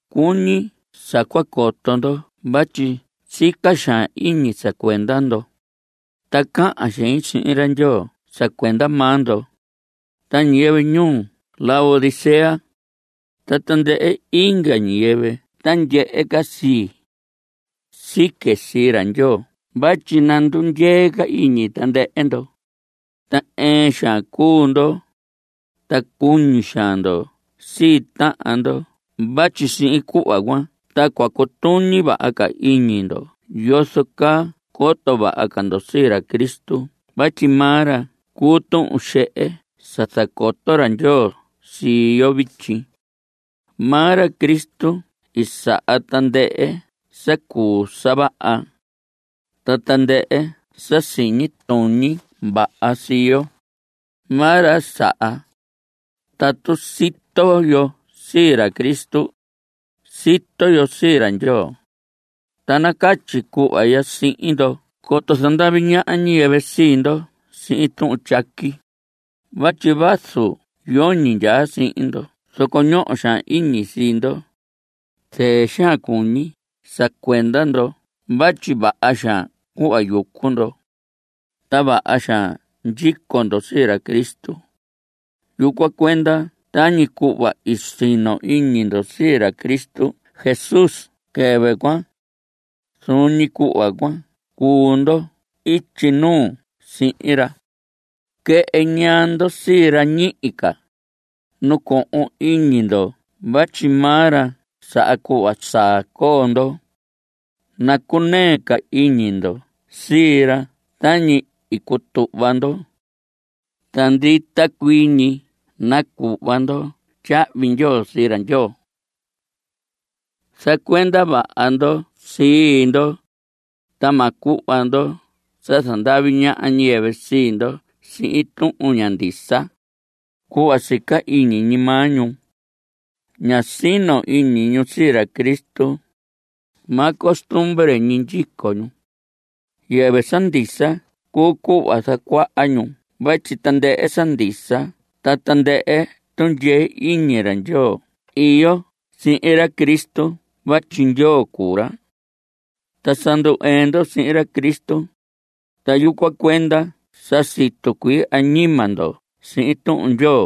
Cuñi sa cua coto ndo vatyi sica xaan iñi sa cuenda ndo, ta cahan xein sihin ra Ndyoo sa cuenda maa ndo, ta ñiyɨvɨ ñuu Laodicea, ta tandɨhɨ inga ñiyɨvɨ ta ndyehe ca sii. Sique sii ra Ndyoo vatyi nandundyee ca iñi tandɨhɨ ndo, ta ɨɨn xaan cuu ndo, ta cuñi xaan ndo sii tahan ndo vatyi sihin cuhva cuan ta cua cutuñi vaha ca iñi ndo yozo caa coto vaha ca ndo sii ra Cristo vatyi maa ra cuu tuhun xehe sa zacoto ra Ndyoo sii yo vityi. Maa ra Cristo saha tandɨhɨ sa cuu sa vaha. Ta tandɨhɨ sa siñi tuñi vaha sii yo, maa ra saha. Tatu sito yo sii ra Cristo, sito yo sii ra Ndyoo. Ta nacatyi cuhva ya sihin ndo coto zandavi ñaha ñiyɨvɨ sii ndo sihin tuhun tyaqui vatyi vazu yoñi ndyaa sihin ndo zoco ñoho xaan iñi sii ndo. Zɨɨ xaan cuñi sa cuenda ndo vatyi vaha xaan cuhva yucu ndo. Ta vaha xaan ndyico ndo sii ra Cristo. Yucuan cuenda tañi cuhva i sino iñi ndo sii ra Cristo Jesús quɨvɨ cuan, zuun ñi cuhva cuan cuhun ndo ityi nuu sihin ra. Quɨhɨ ñaa ndo sii ra ñihi ca. Nacohon iñi ndo vatyi maa ra saha cuhva saa coo ndo. Nacunɨɨ ca iñi ndo sii ra tañi i cutuhva ndo. Ta ndita cuii ñi nacuhva ndo tyahvi ndyoo sii ra Ndyoo. Zacuenda vaha ndo sii ndo, ta ma cuhva ndo sa zandavi ñaha ñiyɨvɨ sii ndo sihin tuhun ña ndisa, cuhva sa sica ñi iñi maa ñu. Ña sino iñi ñu sii ra Cristo. Maa costumbre ñi ndyico ñu. Yɨvɨ sa ndisa cuu cuhva zacuaha ñu vatyi tandɨhɨ sa ndisa ta tandɨhɨ tundyee iñi ra Ndyoo iyo si sihin ra Cristo vatyi Ndyoo cuu ra. Ta sa ndu‑ɨɨn ndo sihin ra Cristo, ta yucuan cuenda sa situ cuii añima ndo sihin Tuhun Ndyoo.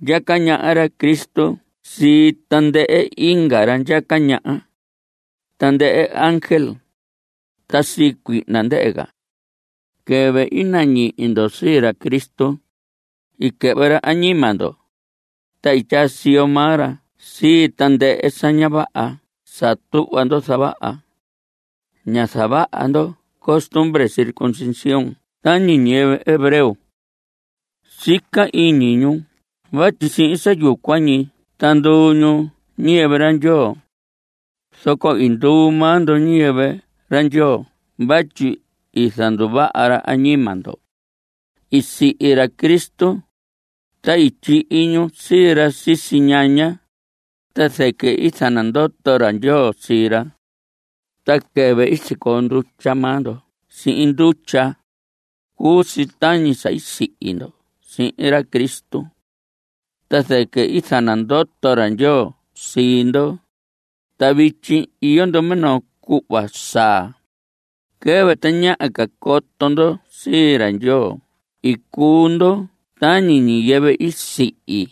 Ndyaca ñaha ra Cristo sii tandɨhɨ inga ra ndyaca ñaha, tandɨhɨ ángel, ta sii cuihna ndɨhɨ ca. Quɨvɨ i nañihi ndo sii ra Cristo, i quɨhvɨ ra añima ndo, ta i tyaa siyo maa ra sii tandɨhɨ sa ña vaha sa tuhva ndo zavaha. Ñá zavaha ndo costumbre circuncisión tañi ñiyɨvɨ hebreo. Sica iñi ñu vatyi sihin sa yucuan ñi ta nduu ñu ñiyɨvɨ ra Ndyoo. Zoco i nduu maa ndo ñiyɨvɨ ra Ndyoo vatyi i zanduvaha ra añima ndo. I sihi ra Cristo, ta i tyihi ñu sii ra sisi ñaña, ta zɨquɨ i zanandoto ra Ndyoo sii ra. Ta quɨvɨ i sicoo ndutya maa ndo sihin ndutya, cuu si tañi sa sihi ndo sihin ra Cristo. Ta zɨquɨ i zanandoto ra Ndyoo sii ndo. Ta vityi iyo ndo minoo cuhva saa. Quɨvɨ tañaha ca coto ndo sii ra Ndyoo i cuu ndo tañi ñiyɨvɨ i sihi,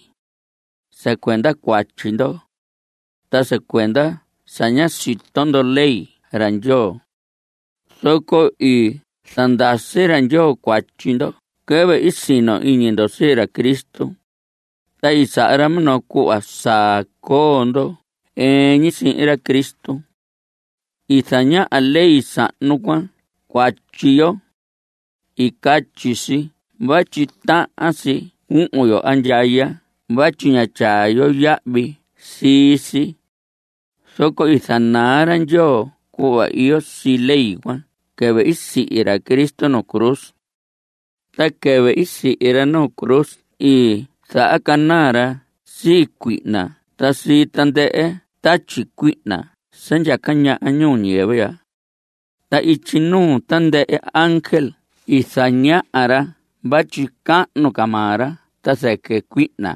sa cuenda cuatyi ndo, ta sa cuenda sa ñá sito ndo ley ra Ndyoo. Zoco i zandasi ra Ndyoo cuatyi ndo quɨvɨ i sino iñi ndo sii ra Cristo, ta i saha ra minoo cuhva saa coo ndo ɨɨn ñi sihin ra Cristo. I zañaha ley sahnu cuan cuatyi yo. I catyi si vatyi tahan si cuhun yo andyaya vatyi ñá tyaa yo yahvi sii si. Zoco i zanaa ra Ndyoo cuhva iyo sii ley cuan quɨvɨ i sihi ra Cristo nu cruz. Ta quɨvɨ i sihi ra nu cruz i zahacanaa ra sii cuihna ta sii tandɨhɨ tatyi cuihna sa ndyaca ñaha ñuu ñiyɨvɨ ya. Ta ityi nuu tandɨhɨ ángel i zañaha ra vatyi cahnu ca maa ra ta zɨquɨ cuihna.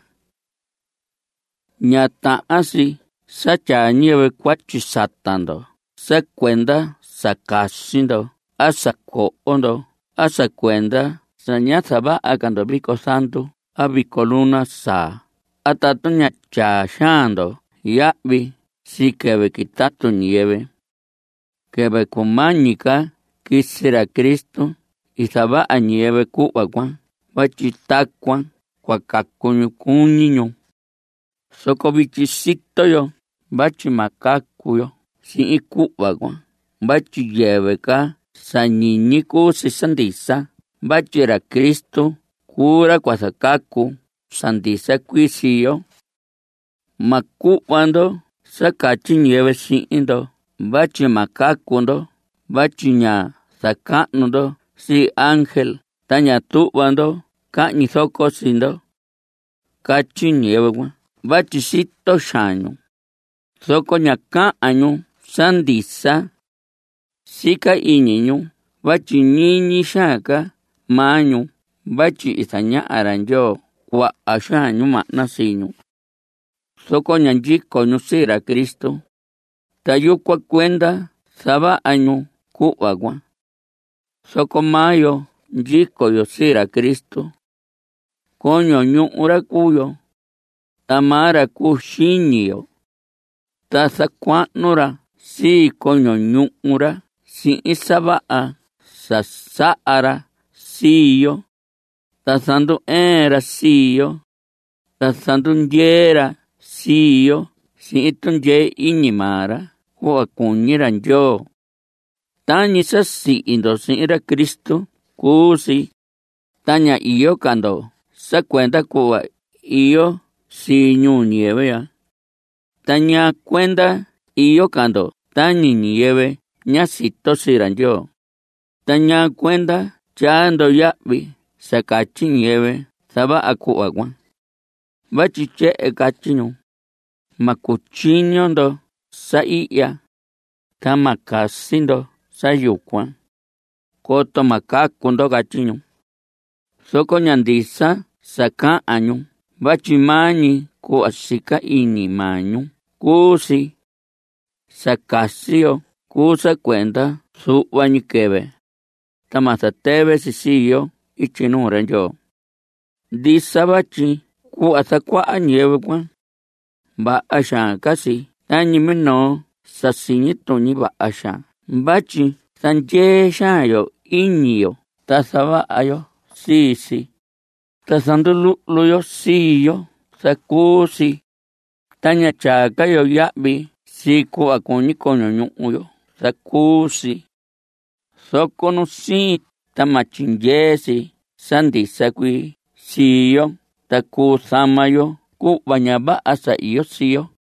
Ña tahan si sa tyaa ñiyɨvɨ cuatyi sata ndo sa cuenda sa casi ndo a sa coho ndo a sa cuenda sa ña zavaha ca ndo vico zandu a vico luna saa a tatu ña tyaa xaan ndo yahvi sii quɨvɨ quitatu ñiyɨvɨ. (Quɨvɨ cumañi ca quisi ra Cristo i zavaha ñiyɨvɨ cuhva cuan vatyi tacuan cua cacu ñu cuñi ñu.) Zoco vityi sito yo vatyi ma cacu yo sihin cuhva cuan vatyi yɨvɨ sa ñiñi cuu si sa ndisa vatyi ra Cristo cuu ra cua zacacu sa ndisa cuii sii yo. Ma cuhva ndo sa catyi ñiyɨvɨ sihin ndo vatyi ma cacu ndo vatyi ña zacahnu ndo sii ángel ta ña tuhva ndo cahñi zoco sii ndo. Catyi ñiyɨvɨ cuan vatyi sito xaan ñu, zoco ña cahan ñu sa ndisa. Sica iñi ñu vatyi ñiñi xaan ca maa ñu vatyi i zañaha ra Ndyoo cuaha xaan ñimahna sii ñu. Zoco ña ndyico ñu sii ra Cristo, ta yucuan cuenda zavaha ñu cuhva cuan. Zoco maa yo ndyico yo sii ra Cristo. Coño ñuhu ra cuu yo, ta maa ra cuu xiñi yo. Ta zacuahnu ra sii coño ñuhu ra sihin sa vaha sa saha ra sii yo. Ta zandu‑ɨɨn ra sii yo. Ta zandundyee ra sii yo sihin tundyee iñi maa ra cuhva cuñi ra Ndyoo. Tañi sa sihi ndo sihin ra Cristo cuu si, ta ña iyo ca ndo sa cuenda cuhva iyo si ñuu ñiyɨvɨ ya. ¿Ta ñaa cuenda iyo ca ndo tañi ñiyɨvɨ ña sito sii ra Ndyoo? ¿Ta ñaa cuenda tyaa ndo yahvi sa catyi ñiyɨvɨ zavaha cuhva cuan? Vatyi tyehen catyi ñu: “Ma cutyiño ndo sa ihya, ta ma casi ndo sa yucuan, coto ma cacu ndo.” Catyi ñu. Zoco ña ndisa sa cahan ñu vatyi maa ñi cuhva sa sica iñi maa ñu cuu si. Sa casi yo cuu sa cuenda zuhva ñi quɨvɨ, ta ma zatɨvɨ si sii yo ityi nuu ra Ndyoo. Ndisa vatyi cuhva zacuaha ñiyɨvɨ cuan, vaha xaan caa si tañi minoo sa siñi tuñi vaha xaan vatyi zandyee xaan yo iñi yo ta zavaha yo sii si, ta zanduluhlu yo sii yo zacuu si, ta ña tyaa ca yo yahvi sii cuhva cuñi coño ñuhu yo zacuu si. Zoco nusiin ta ma tyindyee si sa ndisa cuii sii yo ta cuu zama yo cuhva ña vaha sa iyo sii yo.